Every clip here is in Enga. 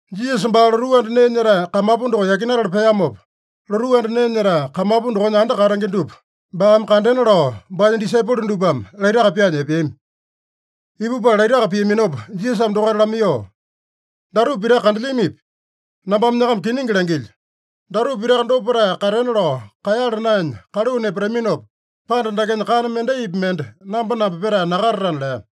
Jisasa baa lotuu anda nee nyetae kamapu doko yakinatala peamopa, lotuu anda nee nyetae kamapu dokonya anda katenge dupa baame kandena lao baanya disaipolo dupame laitaka pyaanya epeami. Ipupala laitaka piaminopa Jisasame dokaita lamaiyoo, “Datupa pitaka kandelyamipi? Nambame nyakama kiningi langilyo: Datupa pitaka dopa petae katena lao kaeyala naenya kaluu nepataminopa, panda dakenya kana mendaipi mende namba-namba petae nakatatana” lea.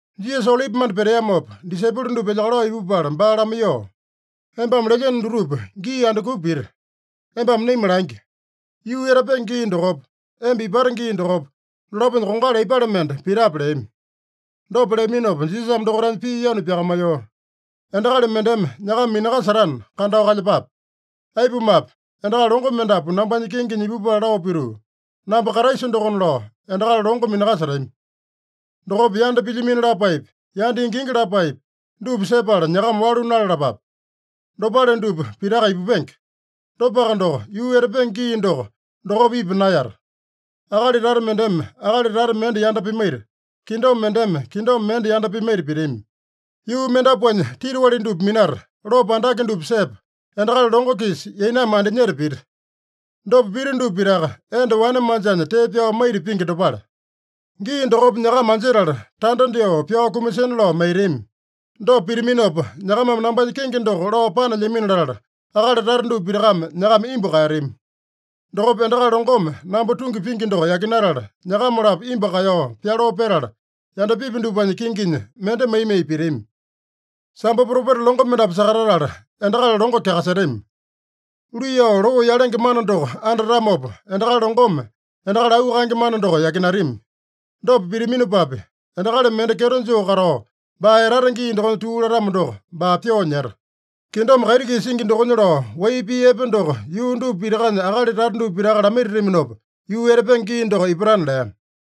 Jisasa Olipimanda peteamopa, disaipolo dupa elyakalao ipupala baa lamaiyoo, “Embame lelyeno dutupa gii andukupa pita? Embame naima langi. Yuu etapenge gii dokopa, emba ipate gii dokopa, dolaponya kongali aipale mende pitape?” leami. Dopa leaminopa Jisasame dokaitanya pii yanu pyakamaiyoo, “Endakali mendeme nyakama minakasetana, kandao kalyepape. Aipumape, endakali longo mendapu nambanya kengenya ipupala lao pituu, ‘Namba Kraisa dokona’ lao endakali longo minakasetami. Dokopa yanda pilyamino lapaepi, yanda ingingi lapaepi, dupa sepala nyakama walu nalalapape. Dopale dupa pitaka ipupenge. Dopaka doko, yuu etapenge gii doko, dokopa ipa naeyata. Akali tata mendeme akali tata mende yanda pimaita, kingdom mendeme kingdom mende yanda pimaita pitami. Yuu mendapuanya titiwali dupa minata, lopo andake dupa sepa, endakali longo-kisa yainame andinyeta pita. Dopa pita dupa pitaka, enda wane manjanya tee pyao maita pingi dopale. “Gii dokopa nyakama anjetala, tanda dyoo pyao kumasina lao maitami. Dopa pitaminopa, nyakamame nambanya kenge doko lao panelyamino latala, akali tata dupa pitakame nyakama imbu kaeyatami. Dokopa endakali longome namba tungi pingi doko yakinatala, nyakama-lapo imbu kaeyao pyaloo petala, yandapipi dupanya kinginya mende mai-mai pitami. Sambo propeta longo mendapu sakatatala, endakali longo kyakasetami. Luiyao loo yalenge mana doko andatamopa, endakali longome endakali auu kaenge mana doko yakinatami. Dopa pitaminopapi, endakali mende kyeto joo katao, baa etata gii dokonya tuu latamo doko, baa pyoo nyeta. Kingdom kaiti-kisa singi dokonya lao wai pii epe doko yuu dupa pitakanya akali tata dupa pitaka lamaitataminopa, yuu etapenge gii doko ipatana” lea.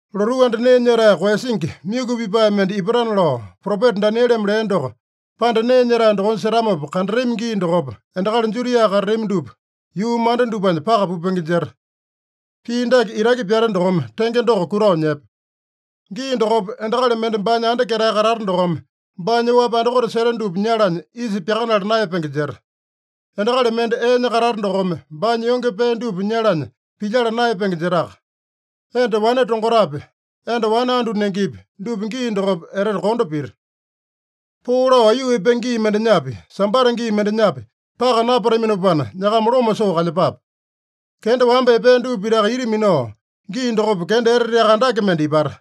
“Lotuu anda nee nyetae koeyasingi, myuku pipae mende ipatana lao propeta Danieleme lea doko, panda nee nyetae dokonya setamopa kandatami gii dokopa, endakali Judia katatami dupa yuu manda dupanya paka pupenge jeta.” (Pii dake itaki pyate dokome tenge doko kutao nyepe.) “Gii dokopa endakali mende baanya anda ketae katata dokome, baanya oapi andakote seta dupa nyalanya isa pyakanala naeyapenge jeta. Endakali mende eenya katata dokome, baanya yonge pee dupa nyalanya pilyala naeyapenge jetaka. Enda wane tongotapi, enda wane andu nengepi, dupa gii dokopa etete kondo pita. Poo lao aiyuu epenge gii mendenyapi, Sambata gii mendenyapi, paka napataminopana nyakama loma soo kalyepape. Kenda wamba epea dupa pitaka ita minao, gii dokopa kenda eteteaka andake mende ipata.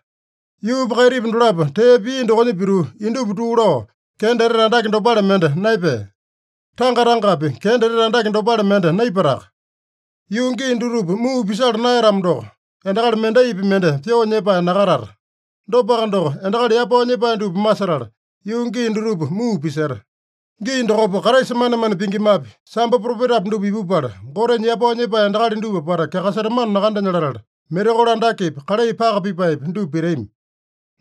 Yuupa kaitipa dolapo tee pia dokonya pituu, indupa tuu lao, kenda etete andake dopale mende naepea. Tanga-tangapi kenda etete andake dopale mende naipataka. Yuu gii dutupa muu pisala naeyatamo doko, endakali mendaipi mende pyoo nyepae nakatata. Dopaka doko, endakali yapao nyepae dupa masetala, yuu gii dutupa muu piseta. Gii dokopa Kraisa manemane pingimapi, sambo propetapi dupa ipupala, Gotenya yapao nyepae endakali dupa apata kyakasetamano nakandenya latala, mirakolo andakepi, kalai paka pipaepi, dupa pitami.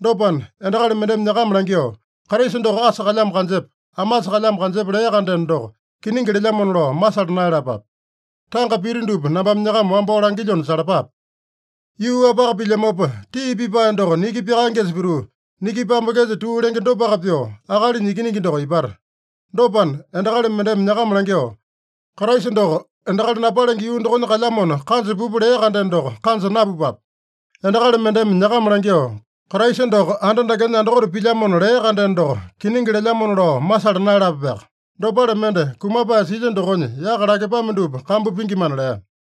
Dopana, endakali mendeme nyakama langyoo, ‘Kraisa doko asa kalyamo kanjepa, amasa kalyamo kanjepa’ lea-kandeno doko, kiningi lelyamona lao masala naeyalapape. Tanga pita dupa nambame nyakama wambao langilyona salapape. Yuu-wapaka pilyamopa, tii pipae doko niki pyakaengesa pituu, niki pambengesa tuu lenge dopaka pyoo, Akalinya Ikiningi doko ipata. Dopana, endakali mendeme nyakama langyoo, ‘Kraisa doko endakali napalenge yuu dokonya kalyamona, kanja pupa’ lea-kandeno doko, kanja napupape. Endakali mendeme nyakama langyoo, ‘Kraisa doko anda dakenya andakote pilyamona’ lea-kandeno doko, kiningi lelyamona lao masala naeyalapapeaka. Dopale mende kumapae silya dokonya yaka lakepame dupa kambu pingimana” lea.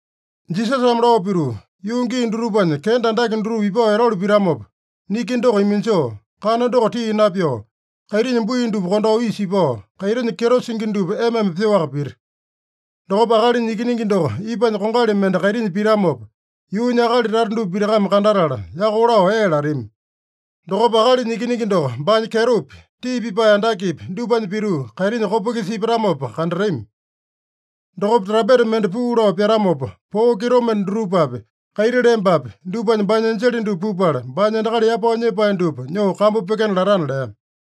Jisasame lao pituu, “Yuu gii dutupanya kenda andake dutupa ipao etalu pitamopa, niki doko iminjoo, kana doko tii napyoo, kaitinya bui dupa kondao isa ipao, kaitinya kyeto singi dupa ema-ema pyoaka pita. Dokopa Akalinya Ikiningi doko ipanya kongali mende kaitinya pitamopa, yuunya akali tata dupa pitakame kandatala, yako lao ee latami. Dokopa Akalinya Ikiningi doko baanya kyetopi, tii pipae andakepi dupanya pituu, kaitinya kopa-kisa ipatamopa kandatami. Dokopa trampeta mende puu lao pyatamopa, poo kitomende dutupapi, kaiti lembapi, dupanya baanya enjele dupa pupala, baanya endakali yapao nyepae dupa nyoo kambu pyekena latana” lea.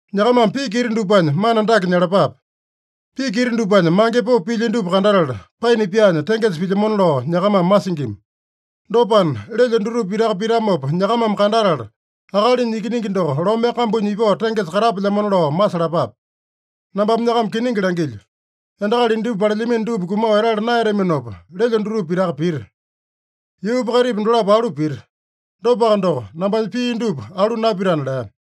“Nyakamame piki ita dupanya mana dake nyalapape: Piki ita dupanya mange popo pilya dupa kandatala, paina pyaanya tengesa pilyamona lao nyakamame masingima. Dopana, lelyo dutupa pitaka pitamopa nyakamame kandatala, Akalinya Ikiningi doko lome kambunya ipao tengesa katapelyamona lao masalapape. Nambame nyakama kiningi langilyo: Endakali indupa palelyamino dupa kumao etala naeyataminopa, lelyo dutupa pitaka pita. Yuupa kaitipa dolapo alu pita. Dopaka doko, nambanya pii dupa alu napitana” lea.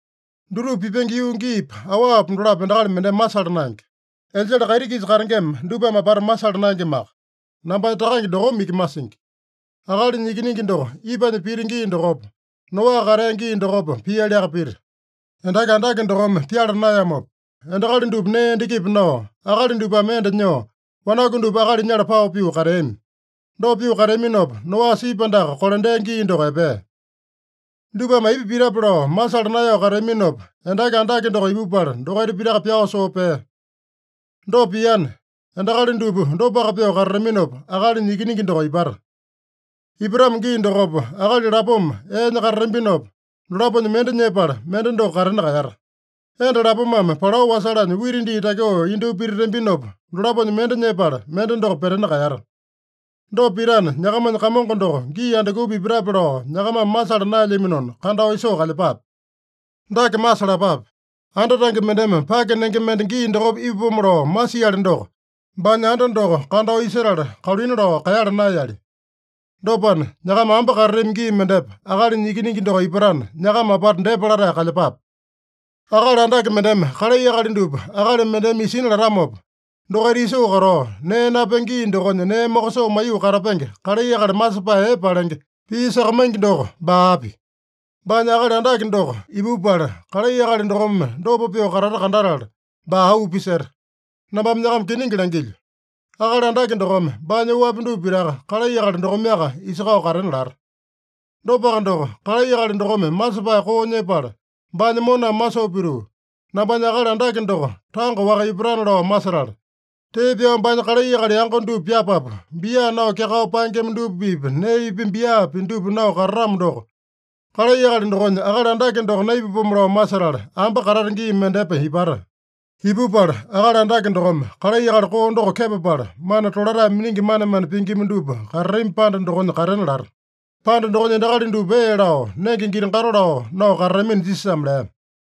“Dutupa pipenge yuu giipa, awapa dolapo endakali mendeme masala naenge. Enjele kaiti-kisa katengema dupame apata masala naengemaka. Nambanya Takange dokome iki masingi. Akalinya Ikiningi doko ipanya pita gii dokopa, Noa katea gii dokopa pialiaka pita. Endaki andake dokome pyala naeyamopa, endakali dupa nee endakipi nao, akali dupame enda nyoo, wanaku dupa akali nyala pao pyoo kateami. Dopa pyoo kateaminopa, Noa sipi andaka kolandea gii doko epea. Dupame aipa pitape lao masala naeyao kateaminopa, endaki andake doko ipupala, dokaita pitaka pyao soo pea. Dopa piana, endakali dupa dopaka pyoo katataminopa, Akalinya Ikiningi doko ipata. Ipatamo gii dokopa, akali lapoma eenya katatambinopa, dolaponya mende nyepala, mende doko katena kaeyata. Enda lapomame palao wasalanya wita dii takyoo indyoo pititambinopa, dolaponya mende nyepala, mende doko petena kaeyata. Dopa pitana, nyakamanya Kamongo doko gii andukupa ipatape lao nyakamame masala naelyaminona, kandao isoo kalyepape. Dake masalapape: Anda tange mendeme pake nenge mende gii dokopa ipapomo lao masiali doko, baanya anda doko kandao isetala, kaluina lao kaeyala naeyali. Dopana, nyakama ambe katatami gii mendepa Akalinya Ikiningi doko ipatana, nyakama apata depa latae kalyepape. “Akali andake mendeme kalai akali dupa akali mendeme isina latamopa, dokaita isoo katao, nee napenge gii dokonya nee mokosoo maiyoo katapenge kalai akali masepae epe palenge, pii sakamaingi doko baa api? Baanya akali andake doko ipupala, kalai akali dokome dopa pyoo katata kandatala, baa auu piseta. Nambame nyakama kiningi langilyo: Akali andake dokome baanya oapi dupa pitaka kalai akali dokomeaka isakao katena lata. Dopaka doko, kalai akali dokome masepae koo nyepala, baanya moname masoo pituu, ‘Nambanya akali andake doko tanga-waka ipatana’ lao masetala, tee pyao baanya kalai akali yango dupa pyapapu, bia nao kyakao paengema dupa-pipa neepi, biapi dupa nao katatamo doko, kalai akali dokonya akali andake doko naipapomo lao masetala, ambe katata gii mendepa ipata. Ipupala akali andake dokome kalai akali koo doko kepapala, mana tolatae miningi manemane pingima dupa katatami panda dokonya katena lata. Panda dokonya endakali dupa ee lao, nenge giti-gato lao nao katatamina” Jisasame lea.